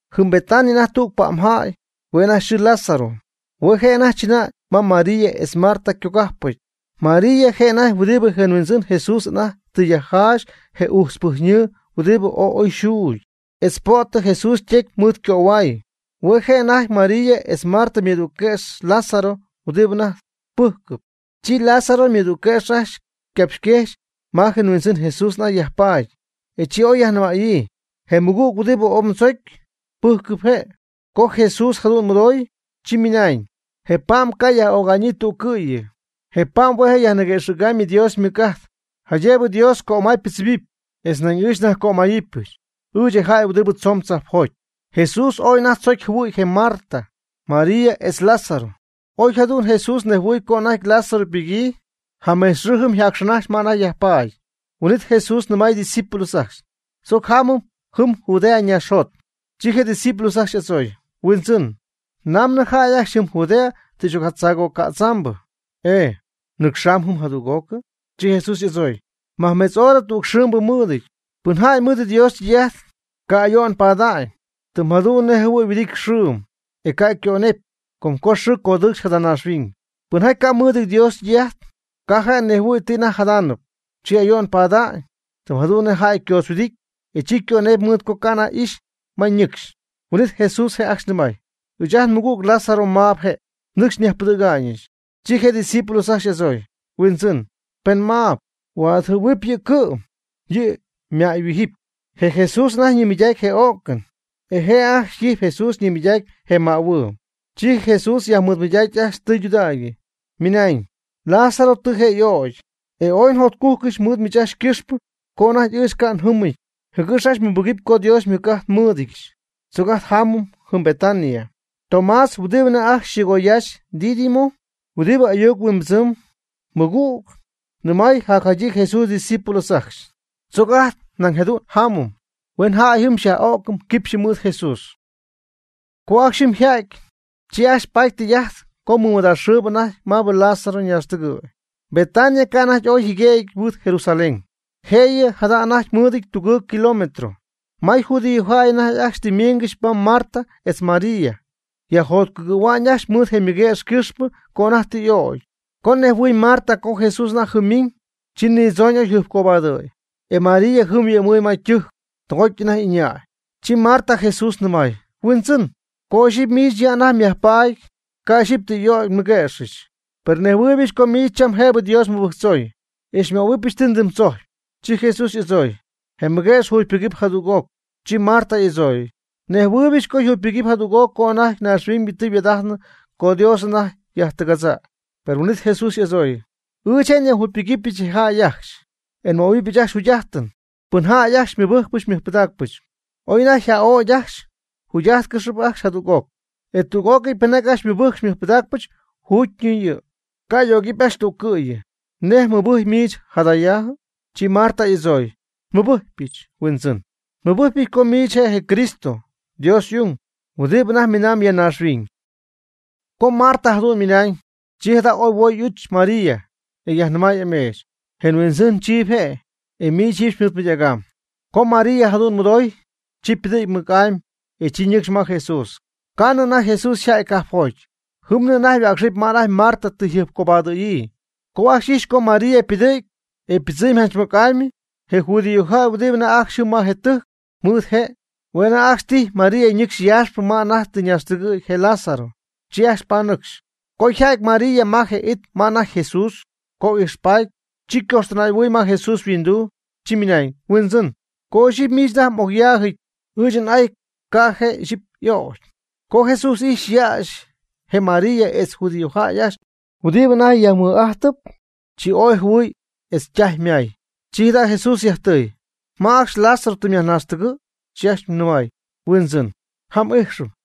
Jɨm Betania anajty tüg pa'mjäy, hue' anajty yxɨɨ Lázaro. Hue' je' anajty chɨnäy ma María etz Marta ycogajpɨty. María je' anajty huɨdibɨ je Huindzɨn Jesús anajty tɨ yajjaxy je ujtzpɨjyñɨɨ huɨdibɨ ooy oy yxuugy, etz po'tɨ Jesús ytecy mɨɨd ycöhuay. Hue' je' anajty María etz Marta ymɨdügquëx Lázaro huɨdibɨ anajty pɨjcɨp. Chi Lázaro ymɨdügquëx ajcxy ycapxyquejxy ma je Huindzɨn Jesús anajty yajpaady, e chi oy yajnɨmäyii: ―Je mmɨgüg huɨdibɨ ooy mdzocy, pɨjcɨp je'. Co Jesús jadu'n mɨdooy, chi ymɨnañ: ―Je' ypa'm ca' yaj'öga'ñyii tüccɨ'yɨ. Je' ypa'm hue' yajniguëxɨ̈gamy Dios ymɨc'ajt, jaydëb Dios ycömaybɨdzɨmɨpy, e nañ ɨɨch nyajcömayɨpyɨch, ɨɨch je jäy huɨdibɨ tzoon tzajpjoty. Jesús ooy anajty tzocy jɨhuɨ̈y je Marta, María etz je Lázaro. Oy jadu'n Jesús nejhuɨɨy co anajty Lázaro ypɨgyii, jamejtz xɨɨ jɨm yjacxɨɨnajxy ma anajty yajpaady. Huin'it Jesús nɨmay ydiscípulos ajcxy: ―Tzoc jamɨm jɨm Judea naaxjot. Chi je' ydiscípulos ajcxy y'adzooy: ―Huindzɨn, namnɨ jäy ajcxy jɨm Judea tɨ xy'ocjaccögädzambɨ, e ¿mnɨcxaanɨp jɨm jadüg'ocɨ? Chi Jesús y'adzooy: ―Majmetz hora tüg xɨɨmbɨ mɨɨdɨty. Pɨnjäy mɨɨd Dios ytɨy'ajt, ca' ayo'n pada'ñ, tɨm jadu'n nej jɨhuɨ̈y yhuɨdity xɨɨm, e ca' ycönepy, com co xɨɨ codɨɨcxy jada naaxhuiñybɨ. Pɨnjäy ca' mɨɨdɨty Dios ytɨy'ajt, ca' je' nejhuɨ̈y ti anajty jadaanɨp, chi ayo'n pada'ñ, tɨm jadu'n nej jäy ycoodzhuɨdity, e chi ycönepy mɨɨd co ca' anajty ixy ma ñɨcxy. Huin'it Jesús je' ajcxy nɨmay: ―Ɨɨch ajt nmɨgüg Lázaro maab je', nɨcxy nyajpɨdɨ̈ga'ñɨch. Chi je' ydiscípulos ajcxy y'adzooy: ―Huindzɨn, pen maab, huaadjɨhuɨ̈jɨ̈huɨp yɨ', cɨ'm yɨ' ymäyhuijɨpy. Je' Jesús anajty ñimɨydaacyp je o'cɨn, e je' ajcxy tijy Jesús ñimɨydaacyp je mähuɨɨ. Chi Jesús yajmɨɨdmɨydacy ajcxy tɨydudägy, ymɨnañ: ―Lázaro tɨ je' y'o'cy. E ooy njotcújcɨdyɨch mɨɨd miich ajcxy ycɨxpɨ co anajty ɨɨch ca' njɨmɨty, jɨgɨx ajcxy mmɨbɨgɨpy co Dios ymɨc'ajt nmɨɨdɨdyɨch. Tzoc ajt jamɨm jɨm Betania. Tomás huɨdibɨ anajty ajcxy yxɨɨgoyaaxyp Dídimo, huɨdi ayuc-huimbɨdzɨm: cuate, nɨmay jacjadyii Jesús ydiscípulos ajcxy: ―Tzoc ajt nañ jadu'n jamɨm, huen jäy jɨm xyaj'o'cɨm quipxy mɨɨd Jesús. Co ajcxy jɨm yja'ty, chi ajcxy paty tɨy'ajt co mɨmɨdaaxxɨɨbɨ anajty maabɨ Lázaro ñaaxtɨgɨ̈y. Betania ca' anajty ooy yjɨguëgyɨty mɨɨd Jerusalén, jëyɨ jada' anajty mɨɨdɨty tugɨɨg kilómetro. May judíojäy ajcxy anajty tɨ ymiiñgɨxy ma Marta etz María, yajjotcugɨ̈hua'ñ ajcxy mɨɨd je' ymɨguëx ycɨxpɨ co anajty tɨ y'ögy. Co nejhuɨ̈y Marta co Jesús anajty jɨm ymiñ, chi nidzooñ oy jɨjpcobadɨ̈y. E María jɨm yhuɨ'mɨɨy ma ytɨjc, tɨgoty anajty ɨñäy. Chi Marta Jesús nɨmay: ―Huindzɨn, co ixyipy miich ya anajty myajpaady, ca' ixyipy tɨ y'ögy nmɨguëxɨch. Per nnejhuɨɨybɨch co miich cham jëbɨ Dios mmɨbɨjctzoy, e xymöhuɨp ti mdɨmdzojcyp. Chi Jesús y'adzooy: ―Je mmɨguëx jugypɨgɨp jadüg'oc. Chi Marta y'adzooy: ―Nnejhuɨɨybɨch co yjugypɨgɨpy jadüg'oc co anajty naaxhuiñybɨ tɨ yhuaad'ajtnɨ co Dios anajty yajtɨgadza'ñ. Per huin'it Jesús y'adzooy: ―Ɨɨch je' nyajjugypɨgɨpyɨch je jäy ajcxy, e nmöhuɨbyɨch ajcxy jugy'ajtɨn. Pɨnjäy ajcxy xymɨbɨjcpɨch xymɨjpɨdaacpɨch, oy anajty yja'ögy ajcxy, jugy'ájtcɨxɨp ajcxy jadüg'oc. E tüg'ócɨy pɨnjaty ajcxy xymɨbɨjcp xymɨjpɨdaacpɨch juugyñɨ, ca' y'ögɨpy ajcxy tüccɨ'yɨ. ¿Nej mɨbɨjcyp miich jadaajɨ? Chi Marta y'adzooy: ―Nmɨbɨjcypɨch, Huindzɨn. Nmɨbɨjcypɨch co miich je' je Cristo, Dios y'ung, huɨdibɨ anajty miinam ya naaxhuiñ. Co Marta jadu'n ymɨnañ, chi jada' oy huoy y'uch María, e yajnɨmay ameech: ―Je Huindzɨn chiiby je', e miich jiiby xymɨɨdmɨydägamb. Co María jadu'n mɨdooy, chi ypɨdɨ̈gy mɨc'amy, e chi ñɨcxy ma Jesús. Ca'nɨ anajty Jesús yja'ty cajpjoty. Jɨmnɨ anajty yhuäcxɨjp ma anajty Marta tɨ yjɨjpcobaadɨ̈yii. Co ajcxy ijxy co María ypɨdɨ̈gy, e ypɨdzɨɨmy janch mɨc'amy, je judíojäy huɨdibɨ anajty ajcxy jɨm ma je tɨjc mɨɨd je', hue' ajcxy tijy María ñɨcxy yaaxpɨ ma anajty tɨ ñaaxtɨgɨ̈y je Lázaro. Chi ajcxy panɨcxy. Co yjädy María ma je it ma anajty Jesús, co ijxpaty, chi ycojxtɨnaay'ahuɨɨy ma Jesús yhuinduu, chi nɨmay: ―Huindzɨn, co ixyipy miich anajty m'ocyaajɨty, ɨɨch n'ay ca' je' ixyipy y'ögy. Co Jesús ijxy yäxy je María etz je judíojäy ajcxy huɨdibɨ anajty yjaymɨɨd'ajtɨp, chi ooy jɨhuɨɨy etz ytaj ymaay. Chi jada' Jesús yajtɨy: ―¿Ma ajcxy Lázaro tɨ myajnaaxtɨgɨ̈? Chi ajcxy nɨmay: ―Huindzɨn, jam ijxɨm.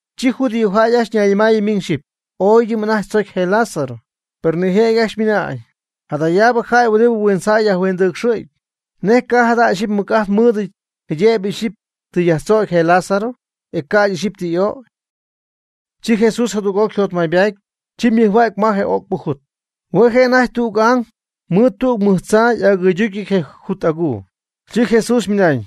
Chi judíojäy ajcxy ñayñɨmaayɨ miñ xyɨpy: ―Ooydɨm anajty tzocy je Lázaro. Per nijëjɨty ajcxy ymɨnañ: ―Jadayaabɨ jäy huɨdibɨ huintzjäy yajhuindɨcxɨ̈gy, ¿nej ca' jada' ixyipy mɨc'ajt mɨɨdɨty jëbɨ ixyipy tɨ yajtzögy je Lázaro, e ca'ydɨ ixyipy tɨ y'ögy? Chi Jesús jadüg'oc yjotmaybaty, chi ymɨjhuägy ma je o'cpɨ jut. Hue' je' anajty tüg ang mɨɨd tüg mɨj tzaa y'agɨyducyɨty je jut aguu. Chi Jesús ymɨnañ: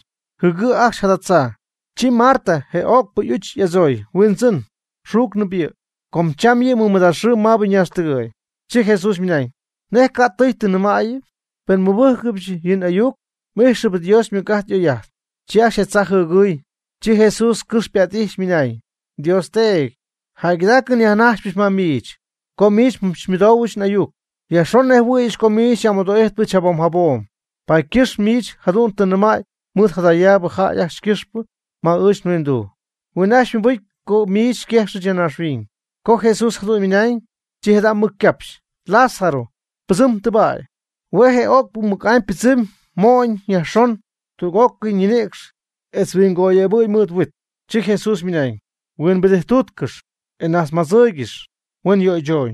―Jɨɨgɨ' ajcxy jada tzaa. E chi Marta je o'cpɨ y'uch y'adzooy: ―Huindzɨn, xuucnɨp yɨ', com cham yɨ' mɨmɨdaaxxɨɨbiñ maabɨ ñaaxtɨgɨ̈y. Chi Jesús ymɨnañ: ―¿Nej cay tɨ jadu'n nnɨmäyɨ? Pen xymɨbɨ́jcɨbɨch yɨ' n'ayuc, m'ixɨpy Dios ymɨc'ajt y'oy'ajt. Chi ajcxy je tzaa jɨɨgɨɨy, chi Jesús cɨx ypa't'ijxy, ymɨnañ: ―Dios Teedy, jäygɨdaacɨn nyajnajxypɨch ma miich, co miich xymɨdoohuɨ n'ayucɨch Yajxon nnejhuɨ̈yɨch co miich xy'amɨdo'ijtpɨch jabom jabom, paady ycɨxp miich jadu'n tɨ nnɨmäy mɨɨd jadayaabɨ jäy ajcxy ycɨxpɨ ma ɨɨch nhuinduu, huen ajcxy mɨbɨcy co miich xyquejxɨch ya naaxhuiñ. Co Jesús jadu'n ymɨnañ, chi jada' mɨc ycapxy: ―Lázaro, pɨdzɨm tɨbäy. Hue' je o'cpɨ mɨc'amy ypɨdzɨmy ymo'nɨty yajxon tüg'ócɨy ñinïcx etz huingoyebɨ̈yɨty mɨɨd huit, chi Jesús ymɨnañ: ―Huimbɨdijttuutcɨxy, e najtzmadzɨɨygɨx, huen yöychooñ.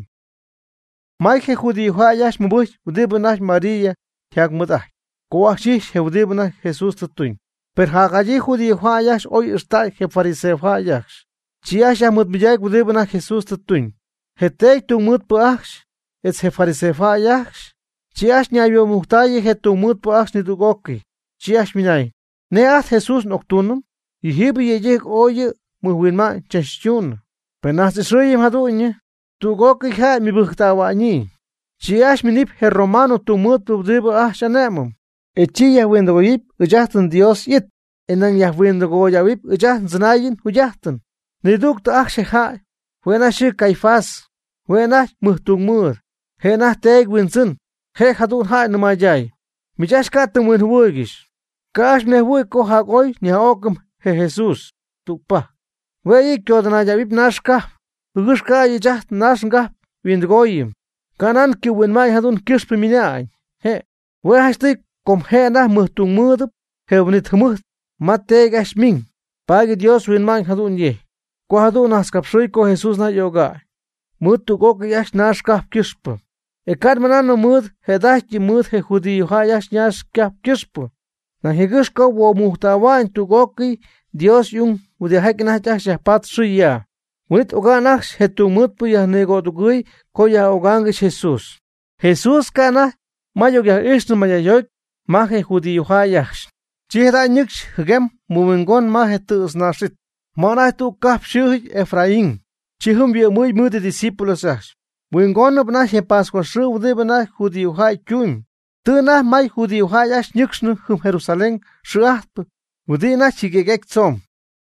May je judíojäy ajcxy ymɨbɨjcy huɨdibɨ anajty María yjaymɨɨd'ajtyp, co ajcxy ijxy je huɨdibɨ anajty Jesús tɨ tuñ. Per jadyii judíojäy ajcxy oy ixtäy je fariseojäy ajcxy, chi ajcxy yajmɨɨdmɨydacy huɨdibɨ anajty Jesús tɨ tuñ. Je teedy tungmɨɨdpɨ ajcxy, etz je fariseojäy ajcxy, chi ajcxy ñayhuoomujctayɨ je tungmɨɨdpɨ ajcxy nidüg'ócɨy, chi ajcxy ymɨnañ: ―¿Nej ajt Jesús n'octuunɨm? Yɨjiibɨ yëydɨjc ooy yɨ' mɨjhuinma'ñ tzachtuunɨ. Pen nnajtz'ɨxɨɨyɨm jadu'ñyɨ, tüg'ócɨy jäy mɨbɨjctähua'ñ yɨ'. Chi ajcxy ymiinɨpy je Romano tungmɨɨdpɨ huɨdibɨ ajt xy'ané'mɨm, e chi yajhuindɨgoyɨpy ɨɨch ajt nDios y'it, e nañ yajhuindɨgoyɨpy ɨɨch ajt ndzɨnaayɨn njugy'ajtɨn. Nidügtɨ ajcxy je jäy, hue' anajty yxɨɨ Caifás, hue' anajty mɨjtungmɨɨd, je' anajty teedy huindzɨn, je' jadu'n jäy nɨmayday: ―Miich ajcxy ca' ti mhuinjɨhuɨɨygɨxy. Ca' ajcxy mnejhuɨ̈y co jac'oy nyaj'o'cɨm je Jesús tügpajc, huen yɨ' codɨnaydähuɨp naax cajp, jɨgɨx ca'ydɨ ɨɨch ajt nnaax ngajp yhuindɨooyɨm. Canan ycɨ'mhuinma'ñ jadu'n ycɨxpɨ ymɨnañ je'. Hue' janchtɨy com je' anajty ymɨjtungmɨɨdɨty je huin'it jɨmɨjt ma teedy ajcxy ymiñ, paady Dios huinma'ñ jadu'n yejcy, co jadu'n najtzcapxɨy co Jesús anajty y'öga'ñ mɨɨd tüg'ócɨy ajcxy naax cajp ycɨxpɨ. E ca' nmɨnaanɨm mɨɨd jëda'ajty mɨɨd je judío ajcxy ñaax ycajp ycɨxpɨ, nañ jëgɨ́x co huoomujctähua'ñ tüg'ócɨy Dios y'ung huɨdijaty anajty ajcxy yajpatp xɨɨ ya. Huin'it oga'n ajcxy je tungmɨɨdpɨ yajnigodugɨɨy co yaj'ögaangɨxy Jesús. Jesús ca' anajty ma y'ocyaj'ijxnɨ mayjäyjoty ma je judíojäy ajcxy. Chi jada' ñɨcxy jɨguem mɨhuingon ma je tɨ̈tznaax'it, ma anajty tüg cajp xɨɨjɨty Efraín. Chi jɨm yhuɨ'mɨy mɨɨd ydiscípulos ajcxy. Huingoonɨp anajty je pascua xɨɨ huɨdibɨ anajty judíojäy ytumyb. Tɨ anajty may judíojäy ajcxy ñinɨcxnɨ jɨm Jerusalén xɨɨ'ajtp huɨdibɨ anajty jɨguëgyjaty tzomb.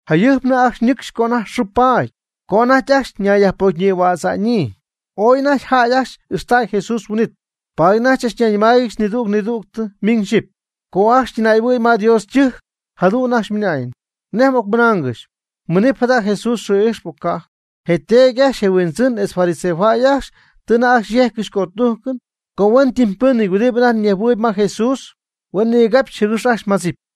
Jayɨjpnɨ ajcxy ñɨcxy ca' anajty xɨɨ paady, co anajty ajcxy ñayyajpocyñïhuädza'ñyii. Ooy anajty jäy ajcxy ijxtäy Jesús huin'it. Paady anajty chachnayñɨmáayɨgɨxy nidüg nidüg miñ xyɨpy, co ajcxy ytɨnay'ahuɨɨy ma Dios ytɨjc, jadu'n ajcxy ymɨnañ: ―¿Nej m'ocmɨnaangɨxy? ¿Minɨpy jada' Jesús xɨɨ'ijxpɨ, o ca'jɨ? Je teedy ajcxy je' yhuindzɨn etz fariseojäy ajcxy tɨ anajty yejccɨxy cötujcɨn co huentɨmpɨnɨty huɨdibɨ anajty nejhuɨɨyb ma je Jesús, huen nigapxy jɨgɨx ajcxy madzɨpy.